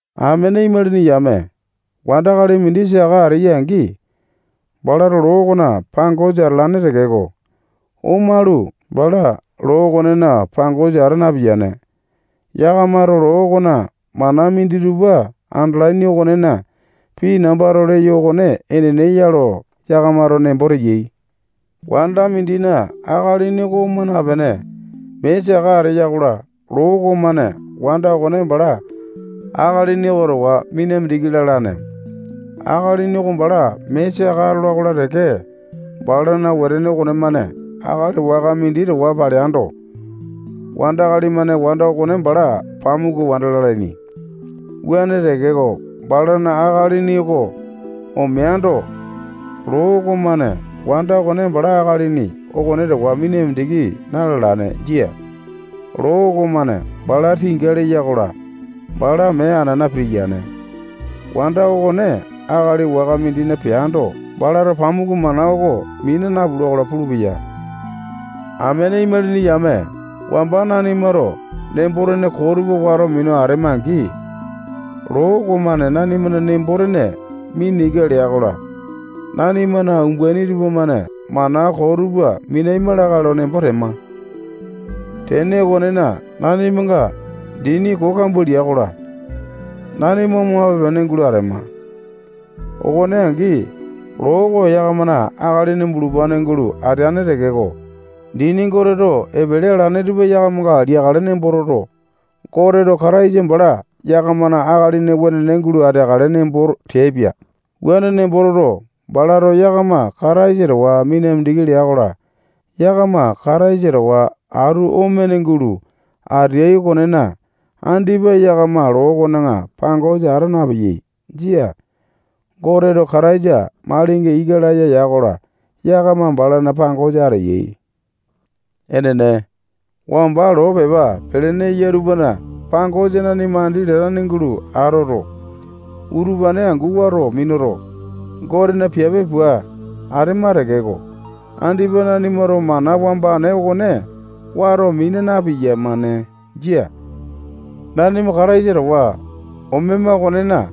Amene imalini yame, wandakali mindi saka ateya-angi, balato loo okona pangosa atalane tekeko, omalu, bala loo okonena pangosa ata napiyane. Yakamato loo okona mana minditupa andalaini okonena, pii nambato leyo okone enene ya lo yakamato nembo teyai. Wanda mindina akalini oko oma napene, mee saka ateya-kola, loo okomane wanda okone bala akalini oko towa mina mindiki lalane. Akalini oko bala mee saka atola-kola teke, balana wetene okonemane akali waka mindi towa paleando, wandakali-mane wanda okone bala pamuku wanda lalaini. Wuane tekeko, balana akalini oko omeando, loo okomane wanda okone bala akalini okone towa mina mindiki na-lalane. Jia. Loo okomane bala tinga leya-kola, bala mee anana pitiyane. Wanda okone akali waka mindina peando, balato pamuku mana oko mina napula-kola pulupeya. Amene imalini yame, wamba nanimato nembo-tene koo tupa wato minu atema-angi, loo okomane nanimana nembo-tene mina ika lea-kola, nanimana umbaini tupamane mana koo tupa minaima lakae lo nembo tema. Tene okonena, nanimanga dini koo kambua lia-kola, nanima omape-pene gulo atema. Okone angi, loo oko yakamana akalini bulupane gulo ateane tekeko, dini Goteto epele alane tupa yakamanga liakale nembo toto, Goteto Kataisa bala yakamana akalini wenene gulo ateakale nembo teaipia. Wuane nembo toto, balato yakama Kataisa towa mina mindiki lea-kola, yakama Kataisa towa atu omene gulo ateai okonena, andipa yakama loo okona pangosa ata napeyai. Jia. Goteto Kataisa malinga ika laya ya-kola, yakama balana pangosa ateyai. Enene, wamba nanima loo pepa pelene eya tupana pangosa andi latane gulo atoto, utupane angu wato minuto, Gotena piape pua atema tekeko, andipa nanimato mana wambane okone wato mina na-piyamane. Jia. Nanima Kataisa towa omema okonena,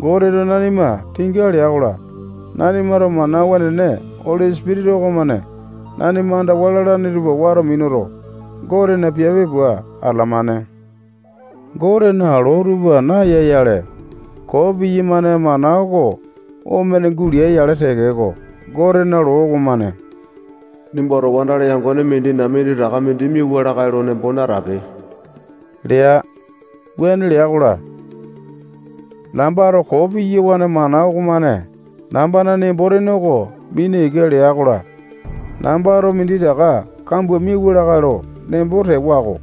Goteto nanima tinga lea-kola, nanimato mana wenene Oli Sipitisa okomane nanima andawa lalane tupa wato minuto, Gotena piape pua atalamane. Gotena loo tupa naya-yale, koo piyamane mana oko omene gulea-yale tekeko, Gotena loo okomane nimbato wandakali yangone mindina minditaka mindi miawa lakae lo nembo natape lea. Wuane lea-kola, nambato koo piyawane mana okomane nambana nembo-tene oko mina ika lea-kola, nambato minditaka kambua miauwa lakae lo nembo tewa-ko.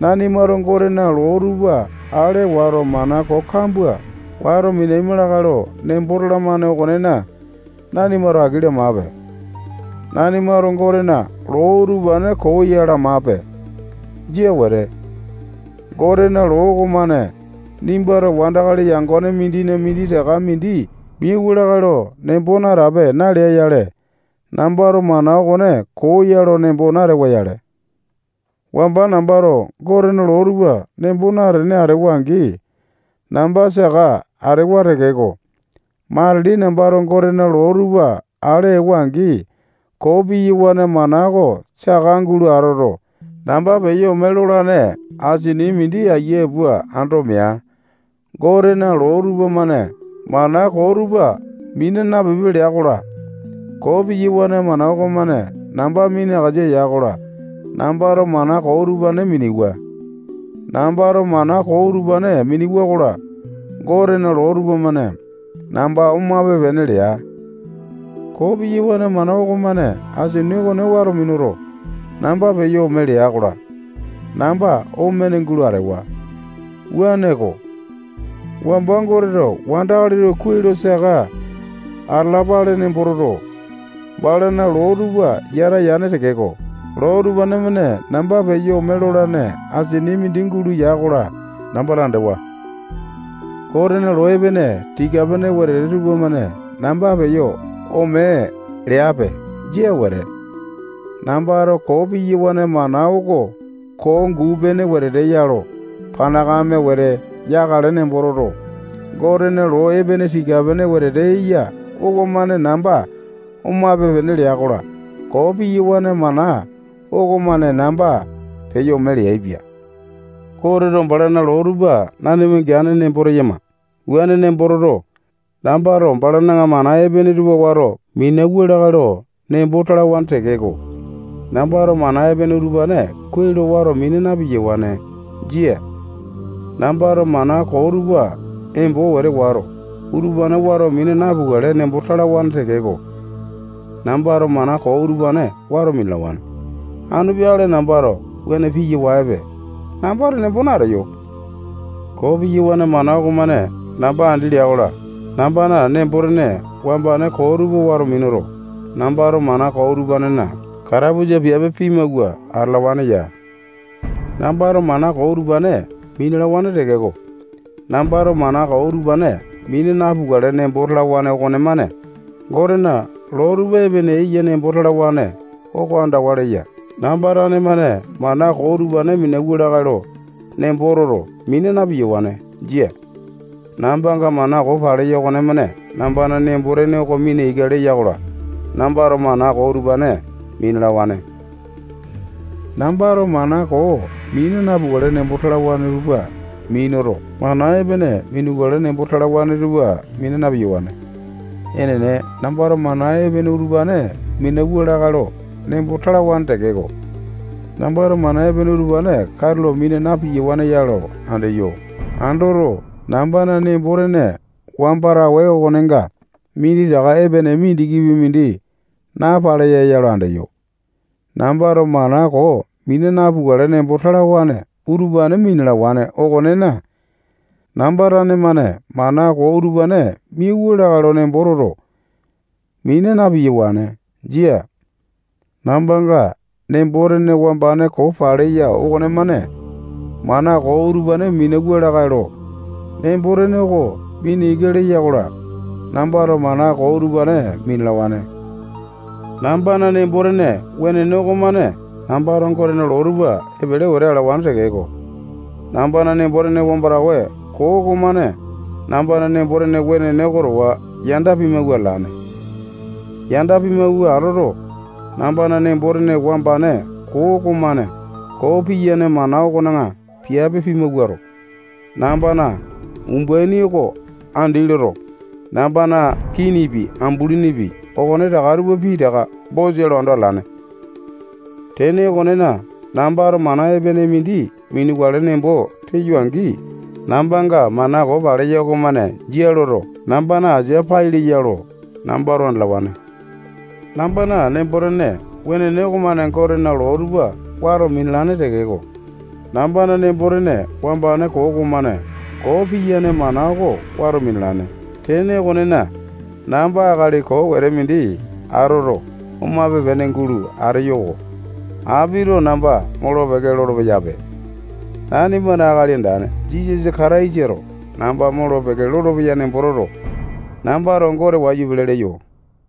Nanimato Gotena loo tupa ale wato, mana koo kambua wato minaima lakae lo nembo talamane okonena, nanimato aki lamape. Nanimato Gotena loo utupane koo ya lamape. Jia wete. Gotena loo okomane nimbato wandakali yangone mindina minditaka mindi miawa lakae lo nembo natape nalea-yale, nambato mana okone koo ya lo nembo natewa-yale. Wamba nambato Gotena loo tupa nembo natene atewa-angi, namba saka atewa tekeko, matili nambato Gotena loo tupa ale ewa-angi, koo piyawane mana oko saka gulo atoto, namba peyo omo lolane asini mindi ayia pua ando mea. Gotena loo tupamane mana koo utupa mina napipe lea-kola, koo piyawane mana okomane namba minakasa ya-kola, nambato mana koo utupane minewa. Nambato mana koo utupane minewa-kola, Gotena loo tupamane namba omape-pene lea. Koo piyawane mana okomane asini okone wato minuto, namba peyo ome lea-kola, namba omene gulo atewa. Wuaneko, wamba Goteto wandakali tupa kuai lo saka atalapale nembo toto, balana loo tupa yata yane tekeko, loo utupane-mane namba peyo ome lolane asini mindi gulo ya-kola, nambato andewa-ko. Gotena loo epene, tika-pene wetete tupamane namba peyo ome leape. Jia wete. Nambato koo piyawane mana oko koo guu-pene wetete ya lo panakame wete yakale nembo toto, Gotena loo epene, tika-pene wetete eya okomane namba omape-pene lea-kola, koo piyawane mana okomane namba peyo ome leaipia. Goteto balana loo tupa nanima geane nembo teyama. Wuane nembo toto, nambato balana mana epene tupa wato minauwa lakae lo nembo talawane tekeko, nambato mana epene utupane kuai lo wato mina na-piyawane. Jia. Nambato mana koo tupa embo wete wato, utupane wato mina napukale nembo talawane tekeko, nambato mana koo utupane wato minalawane. Anu peakale nambato wuane piyawaepe nambato nembo nateyo. Koo piyawane mana okomane namba andi lea-kola, nambana nembo-tene wambane koo tupa wato minuto, nambato mana koo utupanena katapusa piape pimawua atalawane ya. Nambato mana koo utupane minalawane tekeko, nambato mana koo utupane mina napukale nembo talawane okonemane Gotena loo tupa epene eya nembo talawane oko andawa leya. Namba tane-mane mana koo utupane minauwa lakae lo nembo toto, mina na-piyawane. Jia. Nambanga mana koo paleya okonemane nambana nembo-tene oko mina ika leya-kola, nambato mana koo utupane minalawane. Nambato mana koo mina napukale nembo talawane tupa minuto, mana epene minukale nembo talawane tupa mina na-piyawane. Enene, nambato mana epene utupane minauwa lakae lo nembo talawane tekeko, nambato mana epene utupane katulo mina na-piyawane ya lo andeyo. Andoto, nambana nembo-tene wamba tawe okonenga minditaka epene mindikipi mindi napaleya ya lo andeyo. Nambato mana koo mina napukale nembo talawane utupane minalawane okonena, namba tane-mane mana koo utupane minauwa lakae lo nembo toto, mina na-piyawane. Jia. Nambanga nembo-tene wambane koo paleya okonemane mana koo utupane minauwa lakae lo nembo-tene oko mina ika lea-kola, nambato mana koo utupane minalawane. Nambana nembo-tene wenene okomane nambato Gotena loo tupa epele wete alawane tekeko, nambana nembo-tene wambane koo okomane nambana nembo-tene wenene oko towa yanda pimawua atalane. Yanda pimawua atoto, nambana nembo-tene wambane koo okomane koo piyane mana okona piape pimawuato, nambana umbaini oko andi loto, nambana kinipi, ambulinipi, okonetaka tupa pitaka bosa lo ando atalane. Tene okonena, nambato mana epene mindi minukale nembo teyo-angi, nambanga mana koo paleya okomane jia loto, nambana asia pai leya lo nambato andalawane. Nambana nembo-tene wenene okomane Gotena loo tupa wato minalane tekeko, nambana nembo-tene wambane koo okomane koo piyane mana oko wato minalane. Tene okonena, namba akali koo wete mindi atoto, omape-pene gulo ateyo-ko. Apito namba molo-peke lolo-peyape. Nanimana Akali Andane Jisasa Kataisato namba molo-peke lolopeya nembo toto, nambato Gote wayu pele leyo.